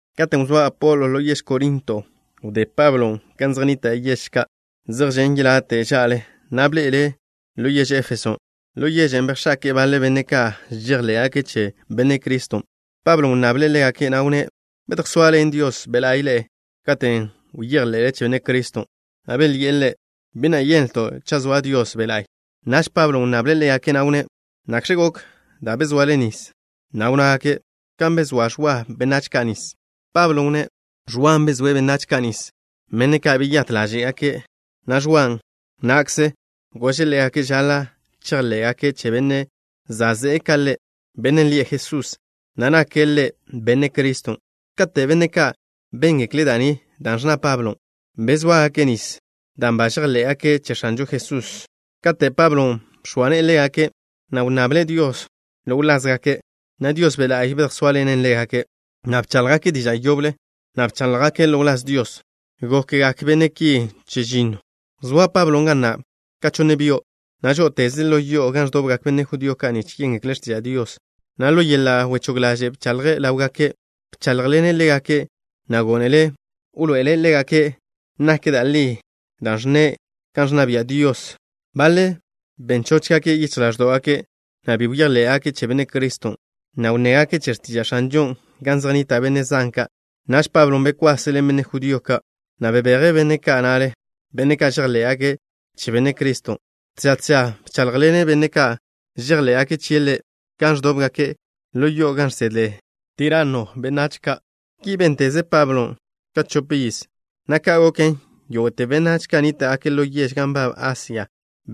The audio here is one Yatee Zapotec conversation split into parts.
Katen' wzóa Apolo ḻo yež Korinto, wdé Pablo gan zej nnita' yež ka' zej žen' yelate' ža'le, na' bḻe'e ḻo yež Éfeso. Ḻo yežen' bejx̱ake'e baḻe benne' ka' žejḻé'gake' che Benne' Criston'. Pablon' wnnable' ḻégake', na' wnné': —¿Bedjsoaḻen Dios Be' La'y ḻe'e katen' bejḻe'le che Benne' Criston'? Belyi'e ḻe': —Bi na' yenlto' cha' zoa Dios Be' La'y. Naž Pablon' wnnable' ḻégake', na' wnné': —¿Nakx̱ gok da' bezoale nis? Na' wnnágake': —Kan bezóa Ẕwa benách ka' nis. Pablon' wnné': —Ẕwan' bezóe' benách ka' nis, benne' ka' beyát ḻáže'gake', na' Ẕwa na'kzen' gože' ḻégake' žaḻa' chejḻé'gake' che Bennen' za' ze'e ka ḻe', Bennen' lie' Jesús, na' nake' Ḻe' Benne' Criston'. Kate' benne' ka' béngekle' da' ni dan' ẕnna Pablon', bezóagake' nis dan' ba žejḻé'gake' che X̱anžo Jesús. Kate' Pablon' bx̱oa ne'e ḻégake', na' wnnable' Dios ḻo wlázgake', na' Dios Be' La'y bedjsóaḻene' ḻégake', na' bcháḻjgake' diža' yoble, na' bcháḻjgake' ḻo wláz Dios. Gokgak benne' ki chežinnoe'. Wzóa Pablon' ga na' ka chonne byo', na' žó'oteze' ḻo yo'o gan ẕdobgak benne' judío ka' nich yéngekle' x̱tiža' Dios, na' ḻo yeḻa' wechóg ḻaže' bchaḻje' ḻáwgake'. Bcháḻjḻene' ḻégake', na' gónele' wḻoe'ele' ḻégake' nak da' li da' ẕnne' kan ẕnna bia' Dios. Baḻe' ben chóchgake' yichj ḻáẕdo'gake', na' bi bejḻé'gake' che Benne' Criston', na' wnnégake' che x̱tiža' X̱anžon' gan zej nnita' benne' zan ka'. Naž Pablon' bekwase' ḻen benne' judío ka', na' bebeje' benne' ka' na'le, benne' ka' žejḻé'gake' che Benne' Criston'. Tža tža bcháḻjḻene' benne' ka' žejḻé'gake' chie' Ḻe' gan ẕdóbgake' ḻo yo'o gan žsedle Tiranno benách ka'. Ki bénteze Pablon' ka chopiz, na' ka' goken, yógo'te benách ka' nníta'gake' ḻo yež ka' gan nbab Asia,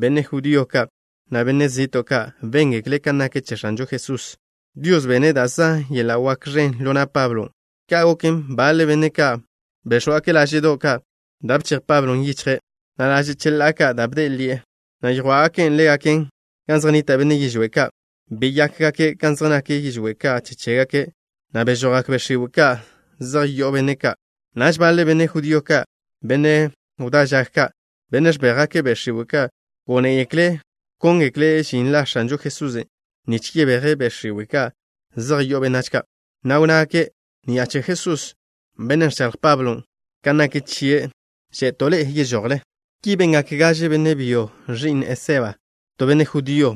benne' judío ka', na' benách zi'to' ka', béngekle' kan nak che X̱anžo Jesusen'. Dios bene' da' zan yeḻa' wak ẕen ḻo na' Pablon'. Ka' goken, baḻe benne' ka' béx̱wgake' láže'do' ka' da' bchej Pablon' yichje', na' laže' cheḻá'a ka' da' bde'e ḻi'e, na' yjwá'gake' ḻégaken gan zej nnita' benne' yižwé' ka'. Beyákgake' kan zej nak yižwé' ka' che chégake', na' bežojgak be' x̱iwe' ka' zej yo'o benne' ka'. Naž baḻe benne' judío, benne' wdá žag ka', benne' ẕbéjgake' be' x̱iwe' ka', gónegekle' wkóngekle' žin la X̱anžo Jesusen' nich yebéjgake' be' x̱iwe' ka' zej yo'o benách ka', na' wnnágake': —Ni'a che la Jesús, Bennen' ẕchaḻj Pablon' kan nak chie', že'to' ḻe'e yežojle. Ki bengak gaže benne' byo ẕi'n Eseba, to benne' judío,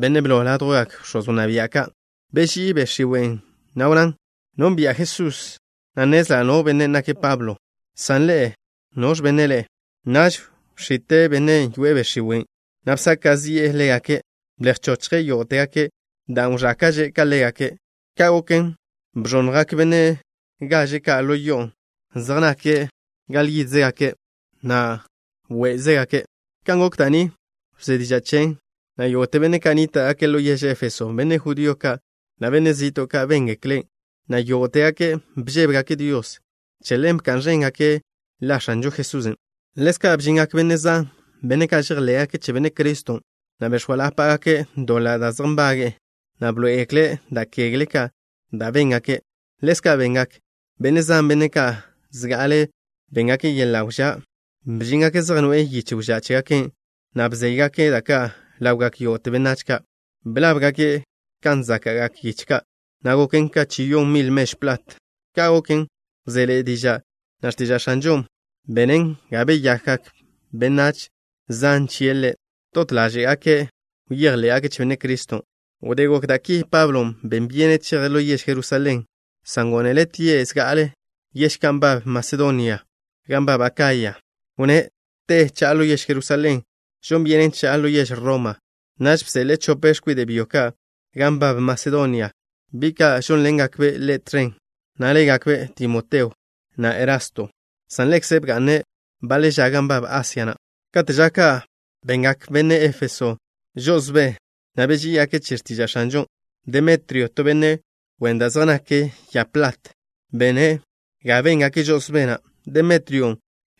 benne' blo ládjwgak bx̱oz wnná bia' ka'. Beží'i be' x̱iwen', na' wnnán: —Nónbi'a Jesusen', na' nnezla' no benne' nake' Pablon', san ḻe'e, ¿noẕ benne' ḻe'e? Naž bx̱ite' bennen' yoe'e be' x̱iwe', na' bsaka' zi'e ḻégake'. Blej bchochje' yógo'tegake', dan' wẕáke'že' ka ḻégake'. Ka' goken bẕonnjgak benne' gaže ka' ḻo yo'on', zej nak gale yídzegake', na' wé'zegake'. Kan gok da' ni wzé diža' chen, na' yógo'te benne' ka' nníta'gake' ḻo yež Éfeso, benne' judío ka', na' benne' zi'to' ka', béngeklen', na' yógo'tegake' bžébegake' Dios. Che ḻen bka'n ẕéngake' la X̱anžo Jesusen'. Ḻezka' bžingak benne' zan, benne' ka' žejḻé'gake' che Benne' Criston', na' bex̱óalapagake' doḻa' da' zej nbage'e, na' bḻoé'egekle' da' kegle ka' da' ba béngake'. Ḻezka' bengak benne' zan, benne' ka' zga'ale béngake' yeḻa' wžá'. Bžíngake' zej noe'e yiche wžá' chégake' ka', na' bzéygake' da' ka' ḻawgak yógo'te benách ka'. Blábgake' kan záka'gak yiche ka', na' goken chi yon mil mežw plat. Ka' goken, wzéḻe'e diža', na' x̱tiža' X̱anžon' benen ga beyakgak benách zan chie' Ḻe'. Dot ḻáže'gake' bejḻé'gake' che Benne' Criston'. Wdé gok da' ki, Pablon' ben byene' cheje' ḻo yež Jerusalén, san gónele' tie' zga'ale yež ka' gan nbab Masedonia, na' gan nbab Akaya. Wnné': —Te cha'a ḻo yež Jerusalén, žon byenen cha'a ḻo yež Roma. Naž bseḻe'e chope x̱kwide' byo ka' gan nbab Masedonia, bi' ka' žónḻengakbe' ḻe' tẕen, na' légakbe' Timoteo, na' Erasto, san ḻekze' bga'ne' baḻe ža gan nbab Asia na'. Kate' ža ka' bengak benne' Éfeso ka' žo'osbé, na' beží'igake' che x̱tiža' X̱anžon'. Demetrio, to benne' wen da' zej naken ya plat, bene' ga béngake' žo'osbé na'. Demetrion'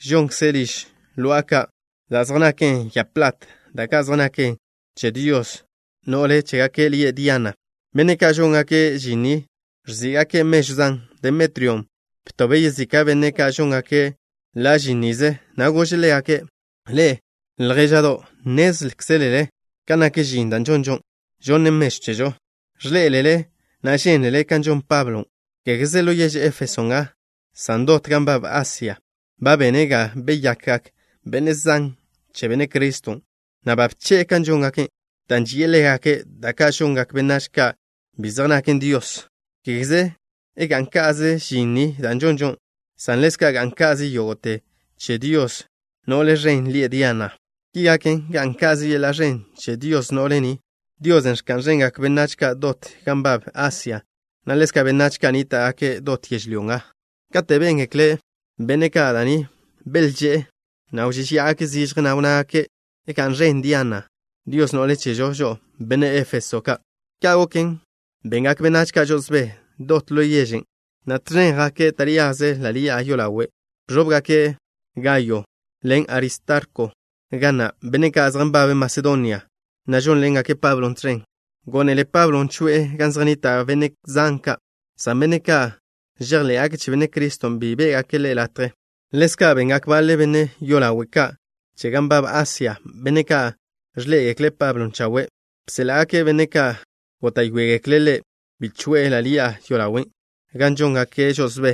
žonkze' liž lo'a ka' da' zej naken ya plat, da' ka' zej naken che dios no'le chégake' lie' Diana. Benne' ka' žóngake' žin ni ẕzí'gake' mežw zan. Demetrion' btobe' yezika' benne' ka' žóngake' ḻa' žin nize, na' gože' ḻégake': —Ḻe'e, ljéža'do' ka', nnézkzelele kan nak žin da' žonžo, žonnen mežw chežo. Ẕḻé'elele, na' žénlele kan žon Pablon'. Kégeze ḻo yež Éfeso nga, san dot gan nbab Asia, ba bene' ga beyakgak benne' zan che Benne' Criston', na' ba bche'e kan žóngake', dan' ži'e ḻégake' da' ka' žongak benách ka' bi zej naken dios. Kégeze ga'n ka'ze žin ni da' žonžo, san ḻezka' ga'n ka'ze yodo' che dios no'le ẕen lie' Diana. Ki gaken, ga'n ka'ze yeḻa' ẕen che dios no'le ni, diosen' ẕka'n ẕengak benách dot gan nbab Asia, na' ḻezka' benách ka' nníta'gake' dot yežlyó nga. Kate' béngekle benne' ka' da' ni, belžé'e, na' wžéžeya'agake' zižje, na' wnnágake': —¡Ga'n ẕen Diana, dios no'le chežo žo'o, benne' Éfeso ka'! Ka' goken, bengak benách ka' žo'osbé dot ḻo yežen', na' tẕen jake' taríaze ḻa' ḻi'a yolawe'. Bẕóbgake' Gayo ḻen Aristarko ga na', benne' ka' zej nbabe' Masedonia, na' žónḻengake' Pablon' tẕen. Gónele Pablon' choe'e gan zej nnita' benne' zan ka', san benne' ka' žejḻé'gake' che Benne' Criston' bi bé'gake' ḻe' latje. Ḻezka' bengak baḻe benne' yolawe' ka' che gan nbab Asia, benne' ka' ẕḻé'egekle' Pablon' chawe'. Bséḻa'gake' benne' ka' góta'yoegekle' ḻe' bi choe'e ḻa' ḻi'a yolawen'. Gan žóngake' žo'osbé,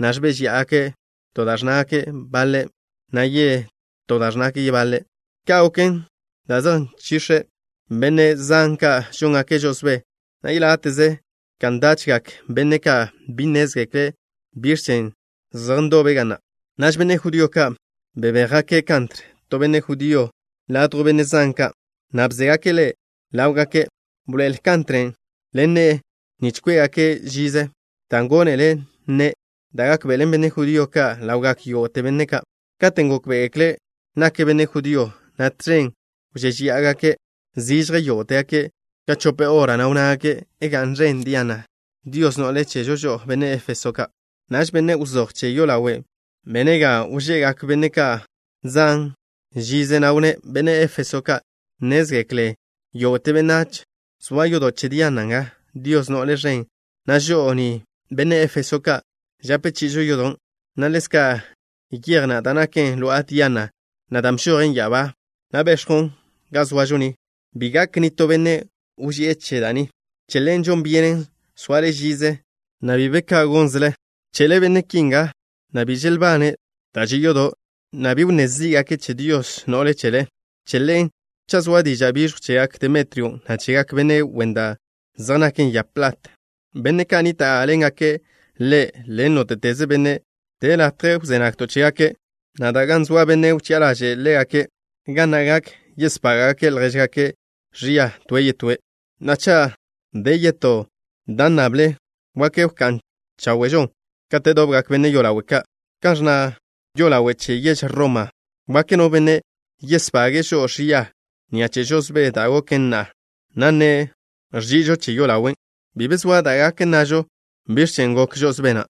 na' ẕbéžeya'agake', to da' ẕnnágake' baḻe', na' yetó da' ẕnnágake' yebaḻe'. Ka' goken dan' zej nchix̱e benne' zan ka' žóngake' žo'osbé, na' yeláte'ze ka ndachgak benne' ka' bi nnézgekle' biẕ chen' zej ndobe' ga na'. Naž benne' judío ka' bebéjgake' Kantr, to benne' judío, ladjw benne' zan ka', na' bzégake' ḻe' ḻáwgake'. Bḻoe'el Kantren' ḻen ne'e, nich kwé'gake' žize, dan' gónele' nne' da' gákḻenen benne' judío ka' ḻawgak yógo'te benne' ka'. Katen' gókbe'egekle' nake' benne' judío, na' tẕen wžéžeya'agake' zižje yógo'tegake' ka chope hora, na' wnnágake': —¡Ga'n ẕen Diana, dios no'le chežo žo'o, benne' Éfeso ka'! Naž benne' wzój che yolawe' bene' ga wže'gak benne' zan ka' žize, na' wnné': —Benne' Éfeso ka', nnézgekle yógo'te benách zoa yodo' che Diana nga, dios no'le ẕen, na' žo'o ni, benne' Éfeso ka', žape chi'ižo yodon', na' ḻezka' yej na' da' naken lo'a Diana na', dan' bžojen ya'abá, na' bex̱jwn ga zoažo ni. Bi gak nitó benne' wži'e che da' ni. Che ḻen žon byenen soale žize, na' bi be ka gónzele. Bche'le benne' ki nga, na' bi želbane' da' že' yodo', na' bi wnné zí'gake' che dios no'le chele. Che ḻen, cha' zoa diža' biẕjw chegak Demetrion', na' chegak benne' wen da' zej naken ya plat, benne' ka' nníta'ḻengake' ḻe', ḻen nóte'teze benne', de latje gan wzé nagto' chégake', na' de gan zoa benne' wchi'a ḻaže'e ḻégake', ga na' gak yesbága'gake' ljéžgake' ẕia toe' yetóe'. Na'a, cha' de yetó da' nnable, wak wká'n cháwe'žon kate' dobgak benne' yolawe' ka', kan ẕnna yolawe' che yež Roma. Wak no benne' yesbage'e žo'o ẕia ni'a che žo'osbé da' goken na'a, na' nne' ẕži'ižo che yolawen'. Bi be zoa da' gak nnažo biẕ chen' gok žo'osbé na'.